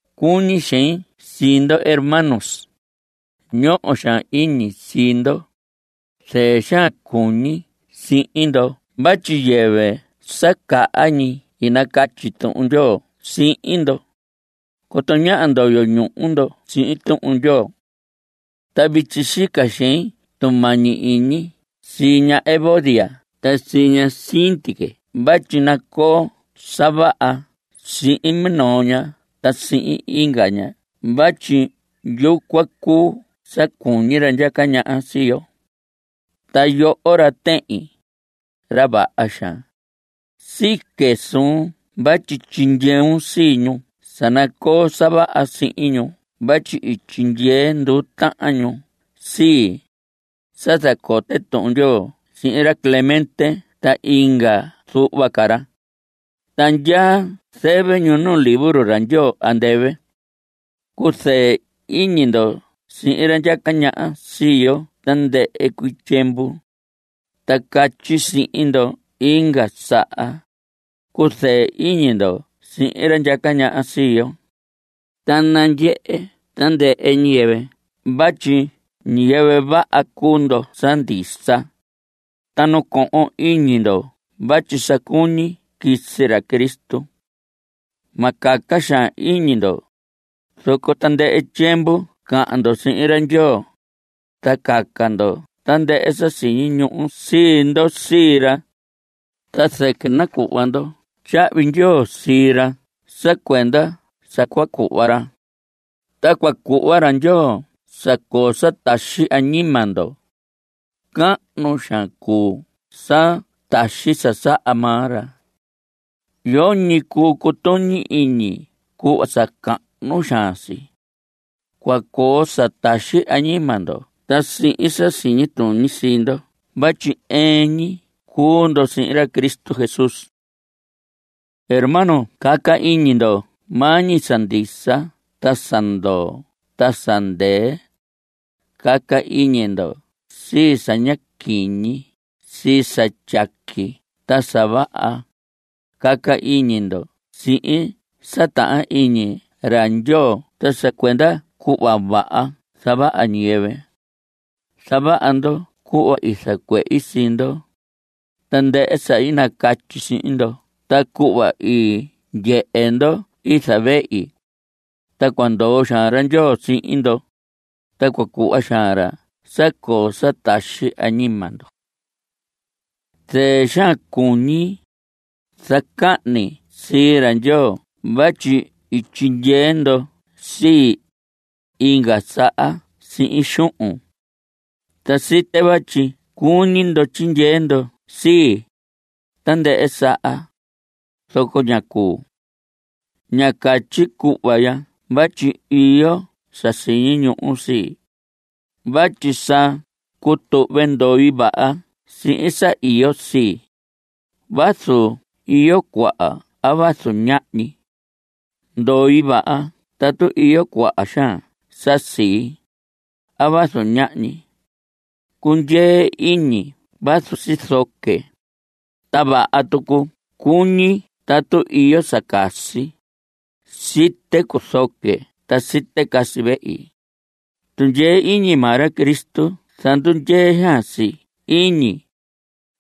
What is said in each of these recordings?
Cuñi xein sii ndo, hermanos. Ñoho xaan iñi sii ndo. Zɨɨ xaan cuñi sihin ndo vatyi yɨvɨ sa caha ñi i nacatyi Tuhun Ndyoo sihin ndo. Coto ñáha ndoyo ñuhu ndo sihin Tuhun Ndyoo. Ta vityi sica xein tumañi iñi sii ña Evodia ta sii ña Síntique vatyi nacoo sa vaha sihin minoo ña ta sihin inga ña vatyi yucuan cuu sa cuñi ra ndyaca ñaha sii yo. Ta yoho ra tehin, ra vaha xaan, sique suun vatyi tyindyeun sii ñu sa nacoo sa vaha sihin ñu vatyi i tyindyee nduu tahan ñu sii, sa zacote Tuhun Ndyoo sihin ra Clemente ta inga zuhva ca ra. Ta ndyaa zɨvɨ ñu nu libro ra Ndyoo andɨvɨ. Cuzɨɨ iñi ndo sihin ra ndyaca ñaha sii yo tandɨhɨ cuii tyiemvu. Ta catyi sihin ndo inga saha, cuzɨɨ iñi ndo sihin ra ndyaca ñaha sii yo. Ta nandyehe tandɨhɨ ñiyɨvɨ vatyi ñiyɨvɨ vaha cuu ndo sa ndisa. Ta nacohon iñi ndo vatyi sa cuñi quisi ra Cristo. Ma caca xaan iñi ndo, zoco tandɨhɨ tyiemvu cahan ndo sihin ra Ndyoo, ta caca ndo tandɨhɨ sa siñi ñuhu sii ndo sii ra. Ta zɨquɨ nacuhva ndo tyahvi ndyoo sii ra sa cuenda sa cua cuhva ra. Ta cua cuhva ra Ndyoo sa coo sa taxi añima ndo. Cahnu xaan cuu sa taxi sa saha maa ra. Yoñi cuu cutuñi iñi cuhva sa cahnu xaan si. Cua coo sa taxi añima ndo ta sihin sa siñi tuñi sii ndo vatyi ɨɨn ñi cuu ndo sihin ra Cristo Jesús. Hermanos, caca iñi ndo maa ñi sa ndisa ta sa ndoo ta sa ndɨɨ. Caca iñi ndo sii sa ña quiñi, sii sa tyaqui ta sa vaha. Caca iñi ndo sii sa tahan iñi ra Ndyoo ta sa cuenda cuhva vaha zavaha ñiyɨvɨ. Zavaha ndo cuhva i zacuehi sii ndo, tandɨhɨ sa i nacatyi sihin ndo ta cuhva i ndyehe ndo i zavehi. Ta cua ndoo xaan ra Ndyoo sihin ndo. Ta cua cuhva xaan ra sa coo sa taxi añima ndo. Zɨɨ xaan cuñi, ta zacahni sii ra Ndyoo vatyi i tyindyee ndo sii, inga saha sihin xuhun. Ta site vatyi cuñi ndo tyindyee ndo sii, tandɨhɨ saha, zoco ña cuu. Ña catyi cuhva ya vatyi iyo sa siñi ñuhu sii, vatyi sa cutuhve ndoi vaha sihin sa iyo sii, vazu iyo cuaha a vazu ñahñi. Ndoi vaha tatu iyo cuaha xaan sa sii, a vazu ñahñi. Cundyee iñi vazu sizoque, ta vaha tucu cuñi tatu iyo sa casi. Site cuzoque, ta site casi vehi. Tundyee iñi maa ra Cristo zandundyee xaan si iñi,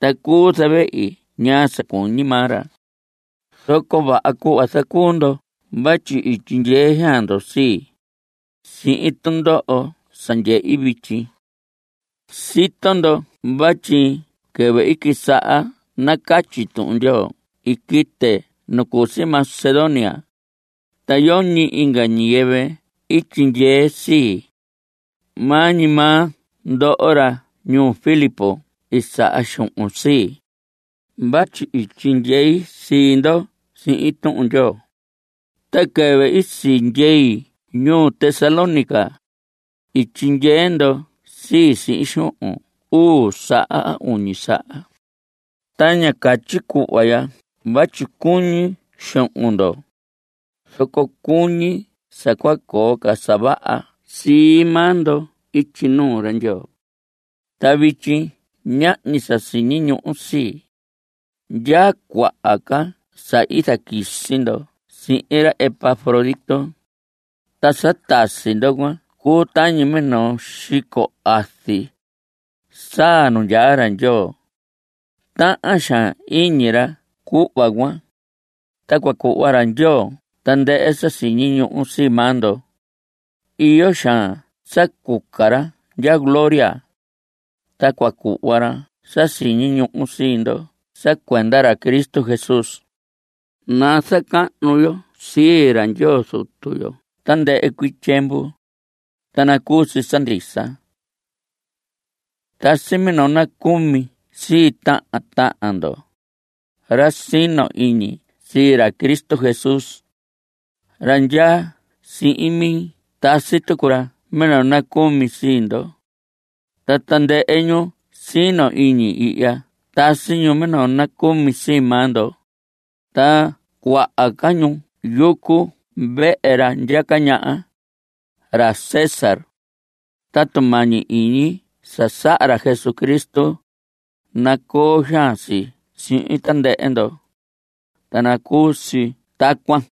ta cuu zavehi ñaa sa cuñi maa ra. Zoco vaha cuhva zacuu ndo vatyi i tyindyee xaan ndo sii, sihin tundoho sa ndyehi vityi. Sito ndo vatyi quɨvɨ i quisaha nacatyi Tuhun Ndyoo i quite nu cu si Macedonia, ta yoñi inga ñiyɨvɨ i tyindyee sii. Maa ñi maa ndoho ra ñuu Filipos i saha xuhun sii, vatyi i tyindyei sii ndo sihin Tuhun Ndyoo. Ta quɨvɨ i sindyei ñuu Tesalónica, i tyindyee ndo sii, sihin xuhun uu saha a uñi saha. Ta ña catyi cuhva ya vatyi cuñi xuhun ndo, zoco cuñi sa cua coo ca sa vaha sii maa ndo ityi nuu ra Ndyoo. Ta vityi ñahñi sa siñi ñuhu sii. Ndyaa cuaha ca sa i zaquisi ndo sihin ra Epafrodito. Ta sa tasi ndo cuan cuu tañi minoo xico azi, saa nu ndyaa ra Ndyoo. Tahan xaan iñi ra cuhva cuan. Ta cua cuhva ra Ndyoo tandɨhɨ sa siñi ñuhu sii maa ndo. Iyo xaan sa cuca ra ndya gloria, ta cua cuhva ra sa siñi ñuhu sii ndo sa cuenda ra Cristo Jesús. Nazacahnu yo sii ra Ndyoo Zutu yo tandɨhɨ cuii tyiemvu. Ta nacuu si sa ndisa. Tasi minoo nacumi sii tahan tahan ndo, ra sino iñi sii ra Cristo Jesús. Ra ndyaa sihin mi tasi tucu ra minoo nacumi sii ndo. Ta tandɨhɨ ñu sino iñi ihya tasi ñu minoo nacumi sii maa ndo, ta cuaha ca ñu yucu vehe ra ndyaca ñaha, ra César. Ta tumañi iñi sa saha ra Jesucristo, nacoo xaan si sihin tandɨhɨ ndo. Ta nacuu si tacuan.